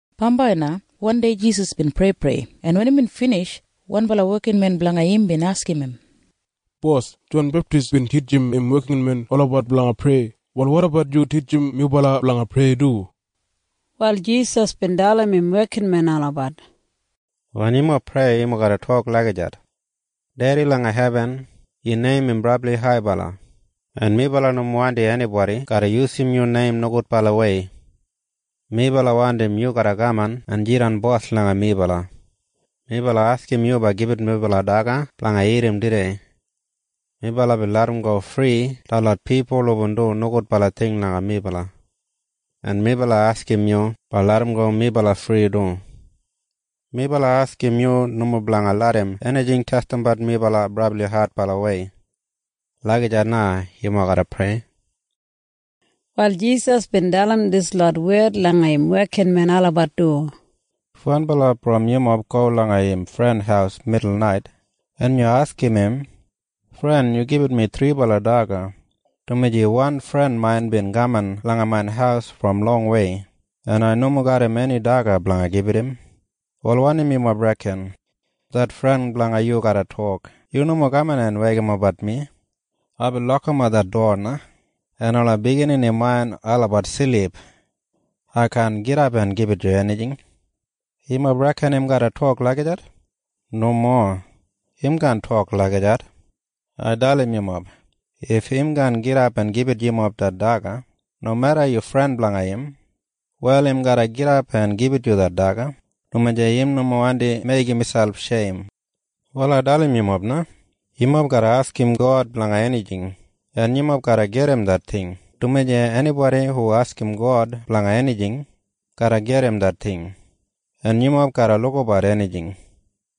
Bambai na wandei Jisas bin preiprei, en wen imbin binij, wanbala wekinmen blanga im bin askim im, “Bos, Jon Beptis bin titjim im wekinmen olabat blanga prei. Wal wotabat yu titjim melabat blanga prei du.” Wal Jisas bin dalim im wekinmen olabat, “Wen yumob prei, yumob garra tok lagijat, ‘Dedi langa hebin, yu neim im brabli haibala, en melabat nomo wandim enibodi garra yusum yu neim nogudbalawei. Melabat wandim yu garra kaman en jidan bos langa melabat. Melabat askim yu blanga gibit melabat daga blanga dagat tudei. Melabat bin larramgo fri detlot pipul hubin dumbat nogudbala ting langa melabat, en melabat askim yu blanga larramgo melabat fri du. Melabat askim yu nomo blanga larram enijing testimbat melabat brabli adbalawei.’ Lagijat na yumob garra prei.” Wal Jisas bin dalim dislot wed langa im wekinmen olabat du, “If wanbala brom yumob go langa im fren haus midulnait, en yu askim im, ‘Fren, yu gibit mi thribala daga, dumaji wan fren main bin kaman langa main haus brom longwei, en ai nomo garram eni daga blanga gibit im.’ Wal wanim yumob reken? Det fren blanga yu garra tok, ‘Yu nomo kaman en weikimapbat mi. Aibin lokimap det dowa na, en ola biginini main olabat silip. Ai kaan gidap en gibit yu enijing.’ Yumob reken im garra tok lagijat? Nomo. Im kaan tok lagijat. Ai dalim yumob. If im kaan gidap en gibit yu det daga nomeda yu fren blanga im, wal im garra gidap en gibit yu det daga dumaji im nomo wandi meigim miselp sheim. “Wal ai dalim yumob na. Yumob garra askim God blanga enijing, en yumob garra gedim det ting, dumaji enibodi hu askim God blanga enijing garra gedim det ting. En yumob garra lukabat enijing,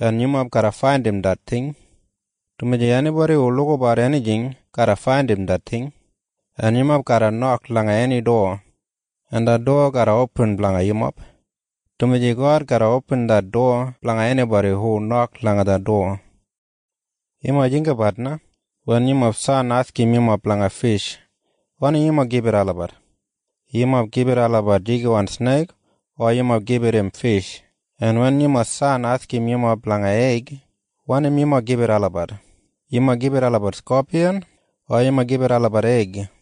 en yumob garra faindim det ting, dumaji enibodi hu lukabat enijing garra faindim det ting. En yumob garra nok langa eni dowa, en det dowa garra opin blanga yumob, dumaji God garra opin det dowa blanga enibodi hu nok langa det dowa. “Yumob jinggabat na. Wen yumob san askim yumob blanga fish, wanim yumob gibit olabat? Yumob gibit olabat jigiwan sneik o yumob gibit im fish? En wen yumob san askim yumob blanga eig, wanim yumob gibit olabat? Yumob gibit olabat skopiyan o yumob gibit olabat eig?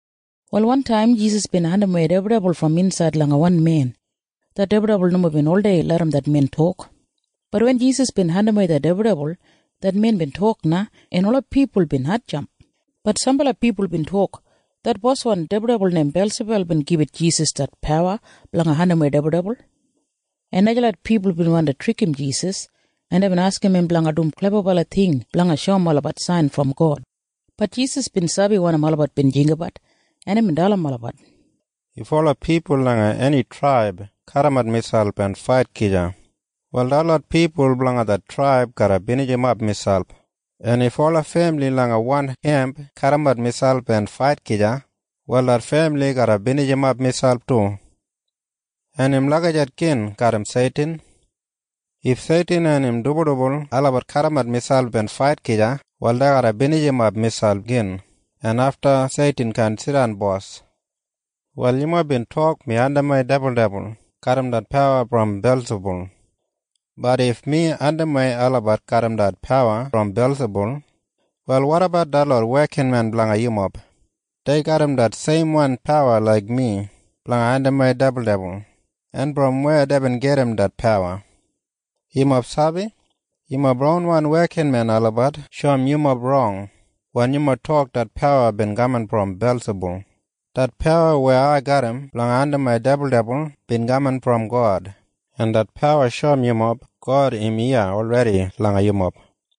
Wal wantaim Jisas bin andimwei dibuldibul brom insaid langa wan men. Det dibuldibul nomo bin oldei larram det men tok. Bat wen Jisas bin andimwei det dibuldibul, det men bin tok na, en ola pipul bin hatjamp. Bat sambala pipul bin tok, “Det boswan dibuldibul neim Belsibul bin gibit Jisas det pawa blanga andimwei dibuldibul.” En najalot pipul bin wandi trikim Jisas, en deibin askim im blanga dum klebabala ting blanga shoum olabat sain brom God. Bat Jisas bin sabi wanim olabat bin jinggabat, en imbin dalim olabat, “If ola pipul langa eni traib kadimat miselp en fait gija, wal detlot pipul blanga det traib garra binijimap miselp. En if ola femili langa wan kemp kadimat miselp en fait gija, wal det femili garra binijimap miselp du. En im lagijat gin garram Seitin. If Seitin en im dibuldibul olabat kadimat miselp en fait gija, wal dei garra binijimap miselp gin, en afta Seitin kaan jidan bos. “Wal yumob bin tok mi andimwei dibuldibul garram det pawa brom Belsibul. Bat if mi andimwei olabat garram det pawa brom Belsibul, wal wotabat detlot wekinmen blanga yumob. Dei garram det seimwan pawa laik mi blanga andimwei dibuldibul. En brom weya deibin gedim det pawa? “Yumob sabi? Yumob ronwan wekinmen olabat shoum yumob rong wen yumob tok det pawa bin kaman brom Belsibul. Det pawa weya ai garram blanga andimwei dibuldibul bin kaman brom God, en det pawa shoum yumob God im iya olredi langa yumob.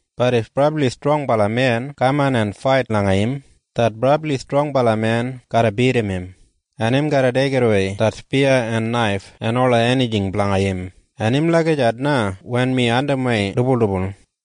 Bat if brabli strongbala men kaman en fait langa im, det brabli strongbala men garra bidim im, en im garra deigidawei det spiya en naif en ola enijing blanga im. En im lagijat na wen mi andimwei dibuldibul.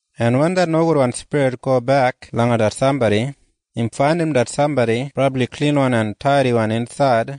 En wen det nogudwan spirit gobek langa det sambodi, im faindim det sambodi brabli klinwan en taidiwan insaid,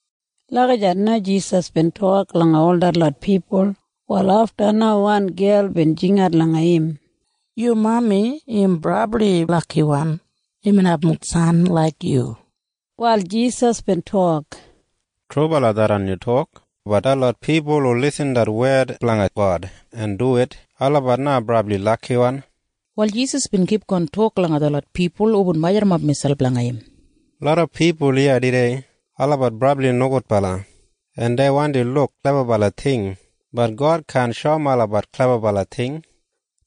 Lagijat na Jisas bin tok langa ol detlot pipul. Wal afta na wan gel bin jingat langa im, “Yu mami im brabli lakiwan imbin abum san laik yu.” Wal Jisas bin tok, “Trubala tharran yubin tok. Bat detlot pipul hu irrim det wed blanga God en duwit, olabat na brabli lakiwan.” Wal Jisas bin kipgon tok langa detlot pipul hubin majurrumap miselp langa im, “Loda pipul iya tudei olabat brabli nogudbala, en dei wandi luk klebabala ting. Bat God kaan shoum olabat klebabala ting.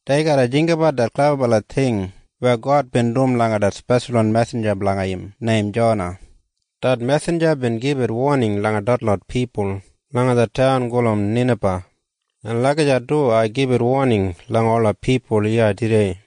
Dei garra jinggabat det klebabala ting weya God bin dum langa det speshalwan mesinja blanga im neim Jona. Det mesinja bin gibit woning langa detlot pipul langa det taun gulum Ninaba. “En lagijat du ai gibit woning langa ola pipul iya tudei.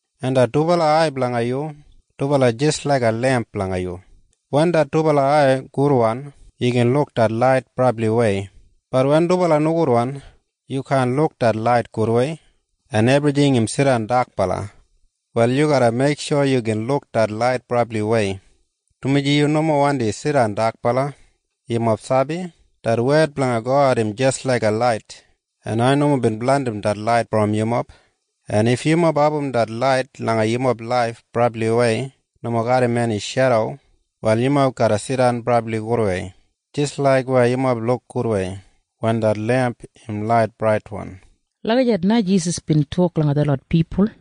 En det dubala ai blanga yu, dubala jis laiga lemp blanga yu. Wen det dubala ai gudwan, yu gin luk det lait brabliwei. Bat wen dubala nogudwan, yu kaan luk det lait gudwei, en ebrijing im jidan dakbala. Wal yu garra meiksho yu gin luk det lait brabliwei, dumaji yu nomo wandi jidan dakbala. “Yumob sabi? Det wed blanga God im jis laiga lait. En ai nomo bin blandim det lait brom yumob. En if yumob abum det lait langa yumob laif brabliwei nomo garram eni shedo, wal yumob garra jidan brabli gudwei jis laik weya yumob luk gudwei wen det lemp im lait braitwan.” Lagijat na Jisas bin tok langa detlot pipul.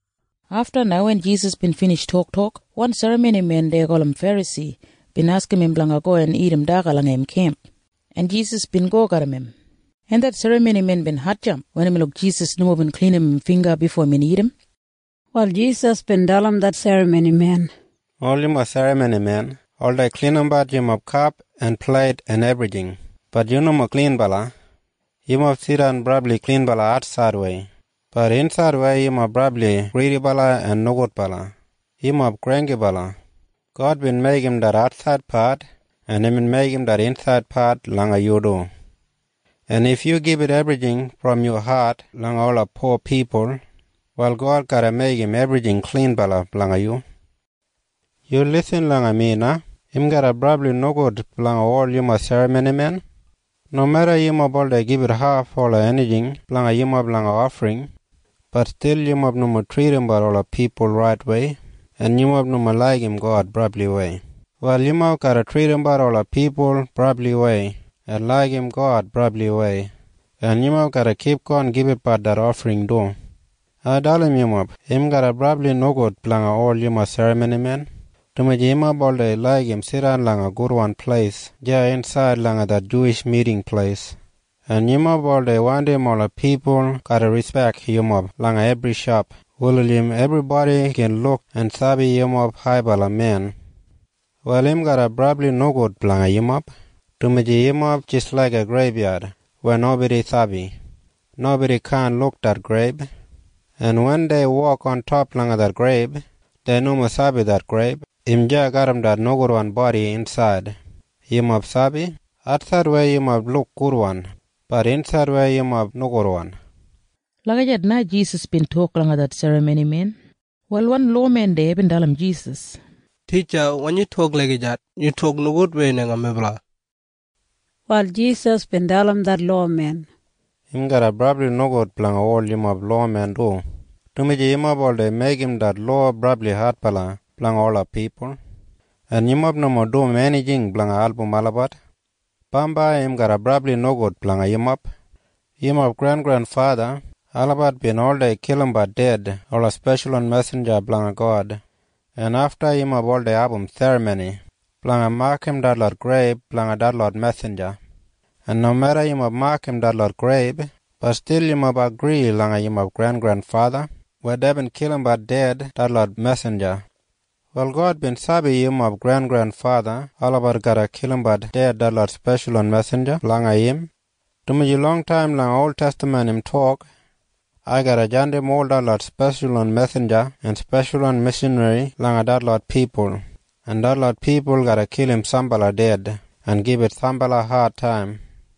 Afta na wen Jisas bin binij toktok, wan serramonimen deya gulum Ferasi bin askim im blanga go en dagat daga langa im kemp, en Jisas bin go garram im, en det serramonimen bin hatjamp wen imbin luk Jisas nomo bin klinim im bingga bifo imbin dagat. Wal Jisas bin dalim det serramonimen, “Ol yumob serramonimen oldei klinimbat yumob kap en pleit en ebrijing. Bat yumob nomo klinbala. Yumob jidan brabli klinwan atsaidwei. Bat insaidwei yumob brabli gridibala en nogudbala. Yumob granggibala! God bin meigim det atsaidpat, en imbin meigim det insaidpat langa yu du. En if yu gibit ebrijing brom yu hat langa ola po pipul, wal God garra meigim ebrijing klinbala blanga yu. “Yu irrim mi na. Im garra brabli nogud blanga ol yumob serramonimen. Nomeda yumob oldei gibit haf ola enijing blanga yumob langa ofring, bat stil yumob nomo tridimbat ola pipul raitwei en yumob nomo laigim God brabliwei. Wal yumob garra tridimbat ola pipul brabliwei en laigim God brabliwei, en yumob garra kipgon gibitbat det ofring du. “Ai dalim yu. Im garra brabli nogud blanga ol yumob serramonimen, dumaji yumob oldei laigim jidan langa gudwan pleis deya insaid langa det Juwish Miting Pleis, en yumob oldei wandim ola pipul garra rispek yumob langa ebri shop wulijim ebribodi gin luk en sabi yumob haibala men. “Wal im garra brabli nogud blanga yumob, dumaji yumob jis laiga greibyad weya nobodi sabi. Nobodi kaan luk det greib, en wen dei wok ontop langa det greib, dei nomo sabi det greib im deya garram det nogudwan bodi insaid. “Yumob sabi? Atsaidwei yumob luk gudwan. Bat insaidwei yumob nogudwan.” Lagijat na Jisas bin tok langa det serramonimen. Wal wan lowamen deya bin dalim Jisas, “Titja, wen yu tok lagijat, yu tok nogudwei langa melabat.” Wal Jisas bin dalim det lowamen, “Im garra brabli nogud blanga ol yumob lowamen du, dumaji yumob oldei meigim det lowa brabli adbala blanga ola pipul, en yumob nomo dum enijing blanga album olabat. “Bambai im garra brabli nogud blanga yumob. Yumob grengrenfatha olabat bin oldei kilimbat ded ola speshalwan mesinja blanga God, en afta yumob oldei abum serramoni blanga makam detlot greib blanga detlot mesinja. En nomeda yumob makam detlot greib, bat stil yumob agri langa yumob grengrenfatha weya deibin kilimbat ded detlot mesinja. “Wal God bin sabi yumob grengrenfatha olabat garra kilimbat ded detlot speshalwan mesinja blanga im, dumaji longtaim langa oltestaman imbin tok, ‘Ai garra jandim ol detlot speshalwan mesinja en speshalwan mishanri langa detlot pipul, en detlot pipul garra kilim sambala ded en gibit sambala adtaim.’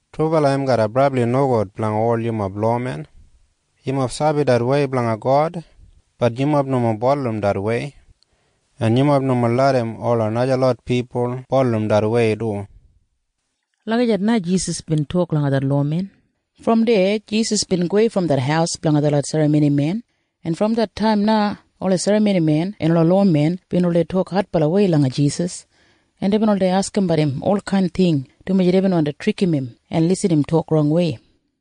“Trubala im garra brabli nogud blanga ol yumob lowamen. Yumob sabi det wei blanga God. Bat yumob nomo bulurrum det wei. En yumob nomo larram ola najalot pipul bulurrum det wei du.” Lagijat na Jisas bin tok langa det lowamen. Brom deya Jisas bin gowei brom det haus blanga det serramonimen, en brom det taim na ola serramonimen en ola lowamen bin oldei tok adbalawei langa Jisas, en deibin oldei askimbat im olkain ting, dumaji deibin wandi trikim im en irrim im tok rongwei.